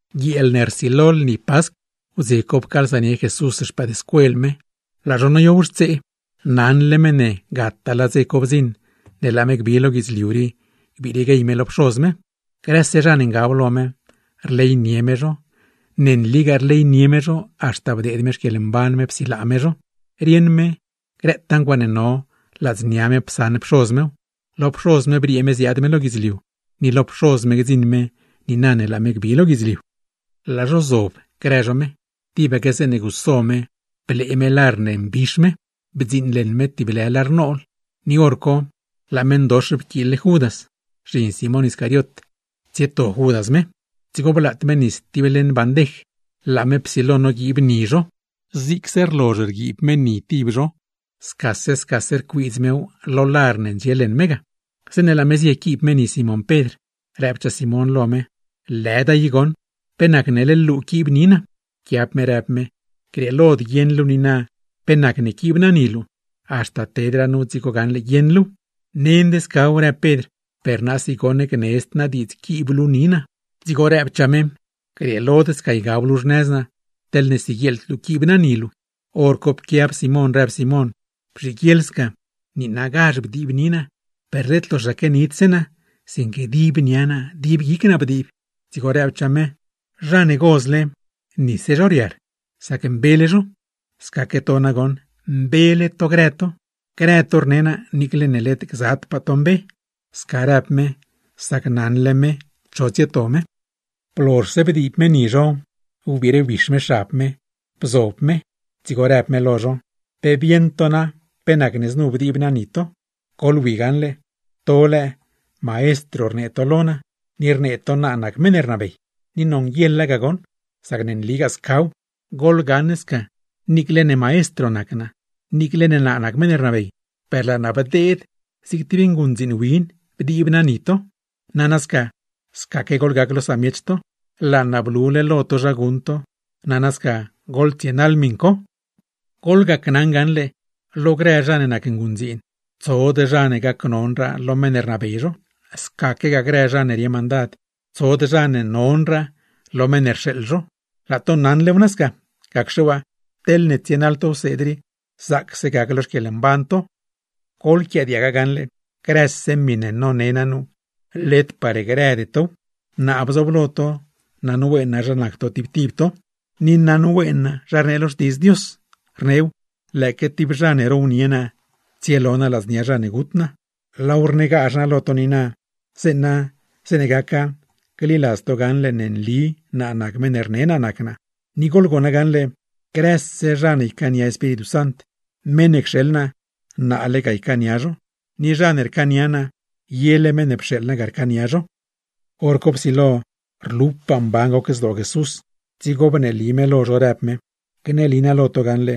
Guieel ne rsilo lni Pascw; wdze co pcaalsanie Jesús no grëse no ne nac no xpëëdscuel me, laa no nodiowxtsee. Rieṉle me ne gataa laa dze co bdziṉ, zeeṉe laa me gbi lo guidzliu rii gbire me lo Pxoz me stib. Grëse zha ne ngab lo me, rleynie me zho; ne nligaa rleynie me zho haxta bdeed me xquieḻmban me psilaa me zho. Rieṉ me grëtaa ncuaaṉe no, ladznia me psaṉ Pxoz mew; lo Pxoz me briee me ziaad me lo guidzliu, ni lo Pxoz me gdziṉ me niina ne laa me gbi lo guidzliu. Laa no zioob no no mezh, tibaque zeeṉe guso me blee me lar ne mbix me, bdziiṉleṉ me tib lë lar nool. Par hor co, laa meṉdox pquiil-le Judas, zhin Simón Iscariot, parne tsieto Judas me. Dzigo blaat me nis tib leṉ bandej laa me psilo noguiib me ni grë zha ne nacgza no, zigse rlozh rguiib me ni tib zho scase scase rcuiidz mew con lar ne ndxie leṉ me ga. Zeeṉe laa me zie quiib me ni Simón Pedr, rëbchaa Simón lo me: ―¡Lëda i goṉ! ¿Pe nacne leḻ luu quiib ni naa? Pquiab me rëb me: ―Grieelod guieṉ luu niina, pe nacne quiib naa ni luu; haxta tedraa nu dzigo gaṉle guieṉ luuw. ―¡Nend scaw! ―rëb Pedr―. ¡Per naasi goṉ gnedzd naa diidz quiib luu ni naa! Dzigo rëbchaa me: ―Grieelod sca ygab luu xnëz naa, teḻne siguieḻd luu quiib naa ni luu. Horco pquiab Simón, rëb Simón: ―Bzhiguieḻ sca, niinagazh bdiib ni naa, per led loxaque nidse naa, sinque dib nia naa, dib guic naa bdiib. Dzigo rëbchaa me: ―Zha ne gozle, nise zho riar; sac mbele zho. Scaque to nagoṉ, mbele to grë to. Grë to rne naa, niicle ne led gzadpaa to mbe. Sca rëb me, sac rieṉle me cho tsieto me. Blozhse bdiib me ni no, wbiire wbix me xab co me, bzob me lo mezh; dzigo në me lo no: ―¿Pe bieṉ to na pe nacne znu bdiib naa ni to? Goḻwi gaṉle: To lëë, Maestro rnee to lo naa, ni rnee to naa nac meṉ rnabey; ni nonguieḻa goṉ, sac ne nligaa scaw. Goḻgaṉ sca, niicle ne maistr naa, niicle ne naa nac meṉ ne rnabey, per laa naa bdeed zig tib nguṉdziin win bdiib naa ni to. Nana sca, scaque goḻgac lo samiech to. Laa naa blule lo to zha guṉ to, nana sca goḻtsienaḻ miṉ co. Gneli naa lo to gaṉle, lo grë zha ne nac nguṉdziin, tsod zha ne nonraa lo zha ne rnabey zho; scaque grë zha ne rie mandad, tsod zha ne nonraa lo zha ne rxeeḻ zho. Laa to naṉlew nasca. Gacxe waa, teḻne tsienaḻ to wseed rii, zaacse gac lo xquieḻmban to. ’Goḻquiaadiag gaṉle, grëse miṉe none naa nu, led par grëde tow. Naa bzooblo to, naṉween naa zha nac to tib tib to, ni naṉween naa zha rnee lo Xtiidz Dios, rneew: “Lëëque tib zha ne rownie naa, grieequia tsielo naa ladznia zha ne gut naa.” Laaw rnegazh naa lo to niina, zeeṉa zeeṉe gaca, gliladz to gaṉle ne nli naa nac meṉ ne rne naa nac naa. Ni goḻgona gaṉle, grëse zha ne ycaania Espíritu Sant, meṉ ne cxeḻ naa, naale ga nocaania zho; ni zha ne rcaania naa, yele meṉ ne pxeeḻ naa ga rcaania zho. Horco psilo rlupaa mban goc zdoo Jesús, dzigo bneeli me lo no në me: ―Gneli naa lo to gaṉle,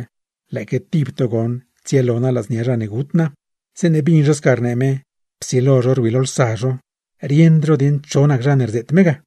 lëëque tib to goṉ tsielo naa ladznia zha ne gut naa. Zeeṉe bdzion no sca rnee me, psilo no rwilolsa no, rieṉd no dieṉ cho nac zha ne rzeet me ga.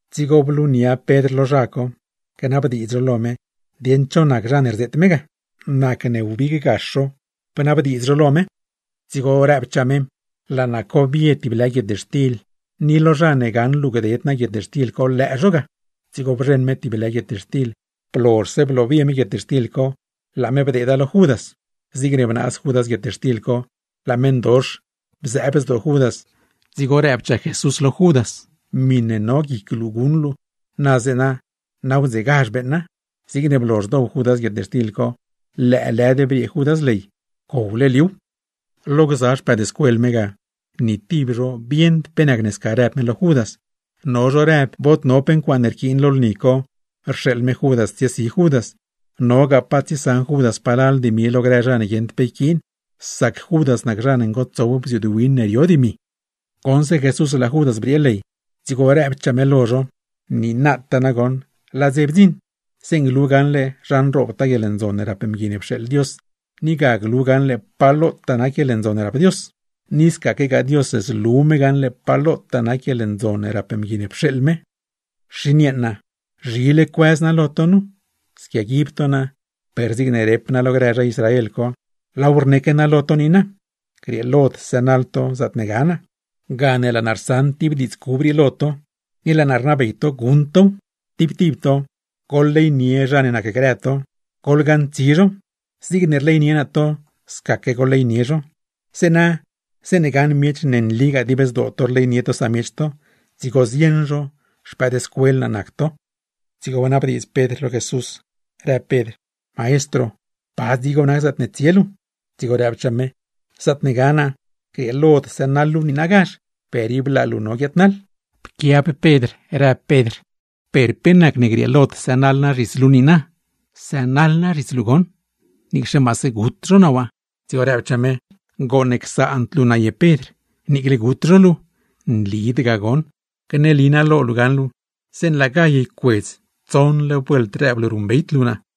dzigo blunia Pedr lo naa, gnabdiidz naa lo me dieṉ cho nac zha ne rzeet me ga. Nacne wbig gax naa, bnabdiidz naa lo me. Dzigo nëchaa me: ―Laa naa cobie tib lë guietxtil, ni lo zha ne gaṉ luu gded naa guietxtil co, lëë zho ga. Dzigo bzheṉ me tib lë guietxtil, blozhse bloobie me guietxtil co, laa me bdeeda lo Judas. Zigne bnaaz Judas guietxtil co, laa meṉdox bzëëb zdoo Judas. Dzigo rëbchaa Jesús lo Judas: ―Miṉe no guic luu guṉ luu, na zeeṉ nawdzegazh beeṉa. Zigne blozh dow Judas guietxtil co, lëëlëd briee Judas ley; pcowle liuw. Lo grë no ne zioobnie no me lo mezh ga, ni tib no bieṉd pe nacne sca rëb me lo Judas. No zho naṉ bod no pe ncuaaṉe rquiin lo lni co, rxeeḻ me Judas tsiesi Judas, o nogaa pa tsiesaṉ Judas palal dimi lo grë zha ne guieṉd pe yquiin; sac Judas nac zha ne ngotsow bziuud win ne no dimi. Goṉse Jesús laa Judas briee ley, dzigo nëchaa me lo no: ―Niina nagoṉ bdziṉ dze zeeṉe glu gaṉle zha nroobtaa guieḻndzon ne rap Mgui ne pxeeḻ Dios, ni ga glu gaṉle pa lotaa nac guieḻndzon ne rap Dios. Ni scaque Dios, zlu me gaṉle pa lotaa nac guieḻndzon ne rap Mgui ne pxeeḻ me ga. Xin yeeṉa, ¡zhile cuëz naa lo to nu! Squiaguib to naa, per zigne rep naa lo grë zha Israel co, laaw rneque naa lo to niina: Grieelod sënaḻ to zaatne ga naa. Gane laa naa rsaṉ tib diidz cub rii, ni laa naa rnabey to guṉ tow: Tib tib to, goḻleynie zha ne nacgrë to, goḻgaṉtsi zho. Zigne rleynie naa to, sca goḻleynie zho. Zeeṉe gaṉ miech, ne nligaa dib zdoo to rleynie to samiech to, dzigo zieṉ zho xpëëdscuel naa nac to. Dzigo bnabdiidz Pedr lo Jesús, rëb Pedr: ―Maestro, ¿pa dzigo nac zaatne tsie luu? Dzigo rëbchaa me: ―Zaatne ga naa, grieelod sënaḻ luu niinagazh; per ib laa luu no guiaadnaḻ. Pquiab Pedr, rëb Pedr: ―¿Per pe nacne grieelod sënaḻ naa zhits luu niina? ¡Sënaḻ naa zhits luu goṉ, niicxe maase gut zho naa waa! Dzigo rëbchaa me: ―¿Gooṉ csaand luu naa ye Pedr, niicle gut zho luu? Nlid ga goṉ. Gneli naa lo luu gaṉle, zeeṉe laa gall ycuedz tsoṉle vuelt rëb luu ruṉbeyd luu naa.